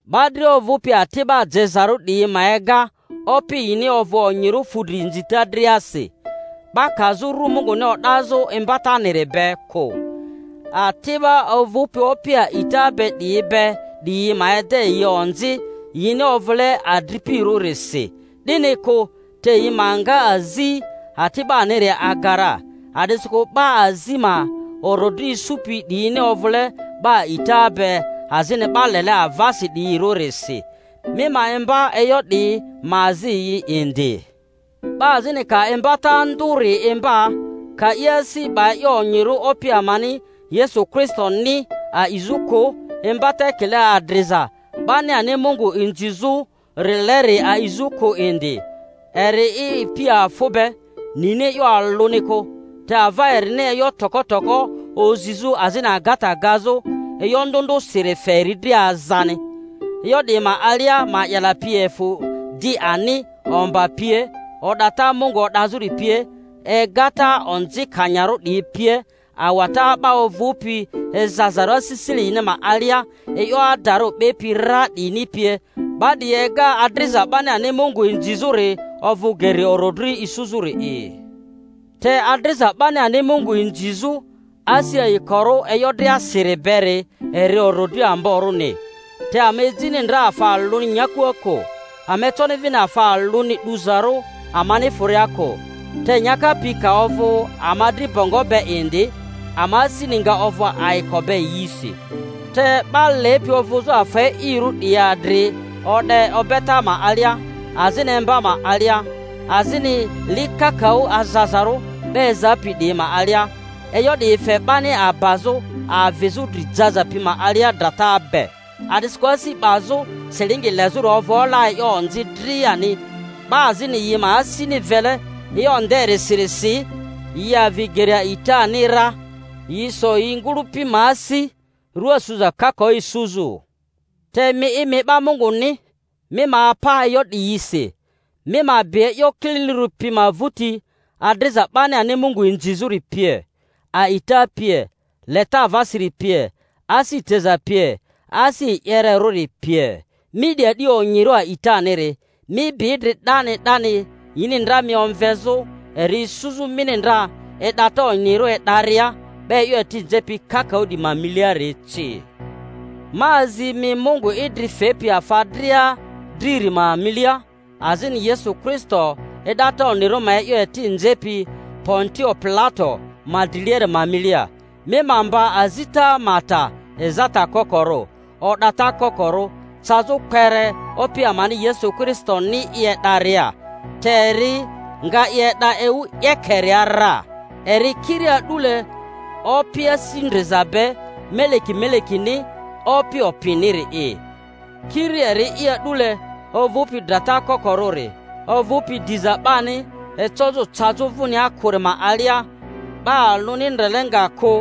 'Ba dria ovᴜpi ati'ba jezarᴜ 'diyi ma ega opi yini ovᴜ onyirᴜ fudri inzita driasi, 'ba kazᴜ ru Munguni o'dazᴜ imbataniri be kᴜ. Ati'ba ovᴜpi opi a'ita be 'diyi be 'diyi ma ede yi onzi, yini ovule adripirᴜrisi, 'dini kᴜ; te yi ma nga azi ati'baniri aga ra, a'disikᴜ 'ba azi ma orodri isupi 'diyini ovᴜle 'ba a'ita be azini 'ba lele avasi 'diyirᴜrisi. Mi ma imba e'yo 'diyi, ma azi yi indi. 'Ba azini ka imbata ndᴜri imba, ka i asi 'ba e'yo onyirᴜ Opi amani Yesu Kristoni a'izᴜ kᴜ, imbata ekile adriza 'bani ani Mungu inzizᴜ-rileri a'izᴜ kᴜ indi, eri i ipi afᴜ be, nini e'yo alᴜni kᴜ; te ava erini e'yo toko toko ozizᴜ azini agata gazᴜ e'yo ndᴜ ndᴜsiri fe eri dri azani; e'yo 'diyi ma alia ma'yala pi efᴜ di ani, omba pie, o'data Mungu o'dazᴜri pie, egata onzikanyarᴜ 'diyi pie, awata 'ba ovᴜpi ezazarᴜ asisile yini ma alia, e'yo adarᴜ 'bepi ra 'diyini pie, 'ba 'diyi ega adriza 'bani ani Mungu inzizᴜri ovᴜ geri orodri isuzᴜri'i. Te adriza 'bani ani Mungu inzizᴜ asi ayikorᴜ e'yo driasiri beri eri orodri amborᴜni; te ama ejini ndra afa alᴜni nyakua kᴜ, ama econi vini afa alᴜni 'duzarᴜ amani fᴜria kᴜ; te nyaka pi ka ovᴜ ama dri bongo be indi, ama asini nga ovᴜ ayiko be yisi. Te 'ba lepi ovᴜzᴜ afa e'irᴜ 'diyi adri o'de obeta ma alia, azini emba ma alia, azini li kakaᴜ azazarᴜ 'ba ezapi 'diyi ma alia, e'yo 'diyi fe 'bani abazᴜ avizᴜ dri jaza pi ma alia drata be. A'disikᴜ asi 'bazᴜ silingi lezᴜri ovᴜ ola e'yo onzi driani; 'ba azini yi ma asini vele e'yo nderisirisi, yi avi geri a'itani ra, yi so yi ngᴜlᴜpi ma asi rua suza kakaᴜ isuzᴜ. Te mi'i, mi 'ba Munguni, mi ma apa e'yo 'diyisi; mi ma bi e'yo kililirᴜri pi ma vᴜti, adriza 'bani ani Mungu inzizᴜri pie, a'ita pie, leta avasiri pie, asi teza pie, asi e'yererᴜri pie. Mi 'di a'di onyirᴜ aitaniri, mi bi idri 'dani 'dani yini ndra mi omvezᴜ eri isuzᴜ mini ndra e'data onyirᴜ e'daria 'ba e'yo eti nzepi kakaᴜ 'diyi ma miliari ci. Ma azi mi Mungu idri fepi afa dria driri ma milia, azini Yesu Kristo e'data onyirᴜ ma e'yo eti nzepi Pontio Pilato ma driliari ma milia, mi ma mba azita ma ta ezata kokorᴜ, o'data kokorᴜ, cazᴜ kpere Opi amani Yesu Kristoni i e'daria; te eri nga i e'da ewu 'yekeria ra, eri kiri a'dule Opi asi ndriza be, Meleki melekini, Opi opiniri'i; kiri eri'i a'dule ovᴜpi drata kokorᴜri, ovᴜpi diza 'bani ecozᴜ cazᴜ vᴜnia kᴜri ma alia, 'ba alᴜni ndrele nga kᴜ,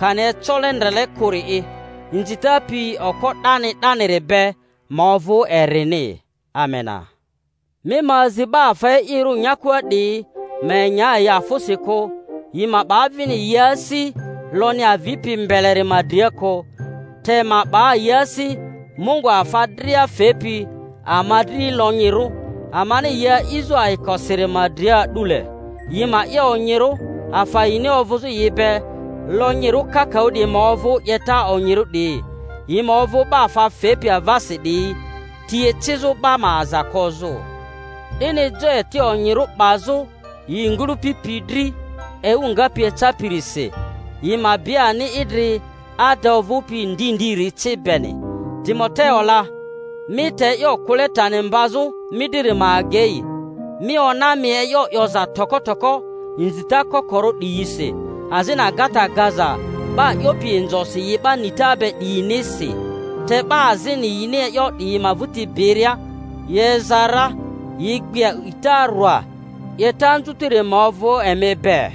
kani ecole ndrele kᴜri'i. Inzita pi okpo 'dani 'daniri be ma ovᴜ erini. Amena. Mi ma azi 'ba afa e'irᴜ nyakua 'diyi ma enya yi afᴜsi kᴜ, yi ma 'ba vini yi asi lonyi avipi mbeleri ma dria kᴜ, te ma 'ba yi asi Mungu afa dria fepi ama dri lonyirᴜ, amani yi a'izᴜ ayikosiri ma dria a'dule. Yi ma 'ye onyirᴜ, afa yini ovᴜzᴜ yi be lonyirᴜ kakaᴜ 'diyi ma ovᴜ 'yeta onyirᴜ 'diyi, yi ma ovᴜ 'ba afa fepi avasi 'diyi, ti ecizᴜ 'ba ma aza kozᴜ, 'dini jo eti onyirᴜ 'bazᴜ yi ngᴜlᴜ-pi dri ewu ngapi ecapirisi, yi ma bi ani idri ada ovᴜpi ndi ndiri ci beni. Timoteo la, mi te e'yo kᴜle tani mbazᴜ mi driri ma agei, mi ona mi e'yo 'yoza toko toko inzita kokorᴜ 'diyisi, azini agata gaza 'ba 'yopi inzosi yi 'ba nita be 'diyinisi; te 'ba azini yini e'yo 'diyi ma vᴜti biria yi eza ra, yi gbi a'ita rwa. 'Yeta anzutiri ma ovᴜ emi be.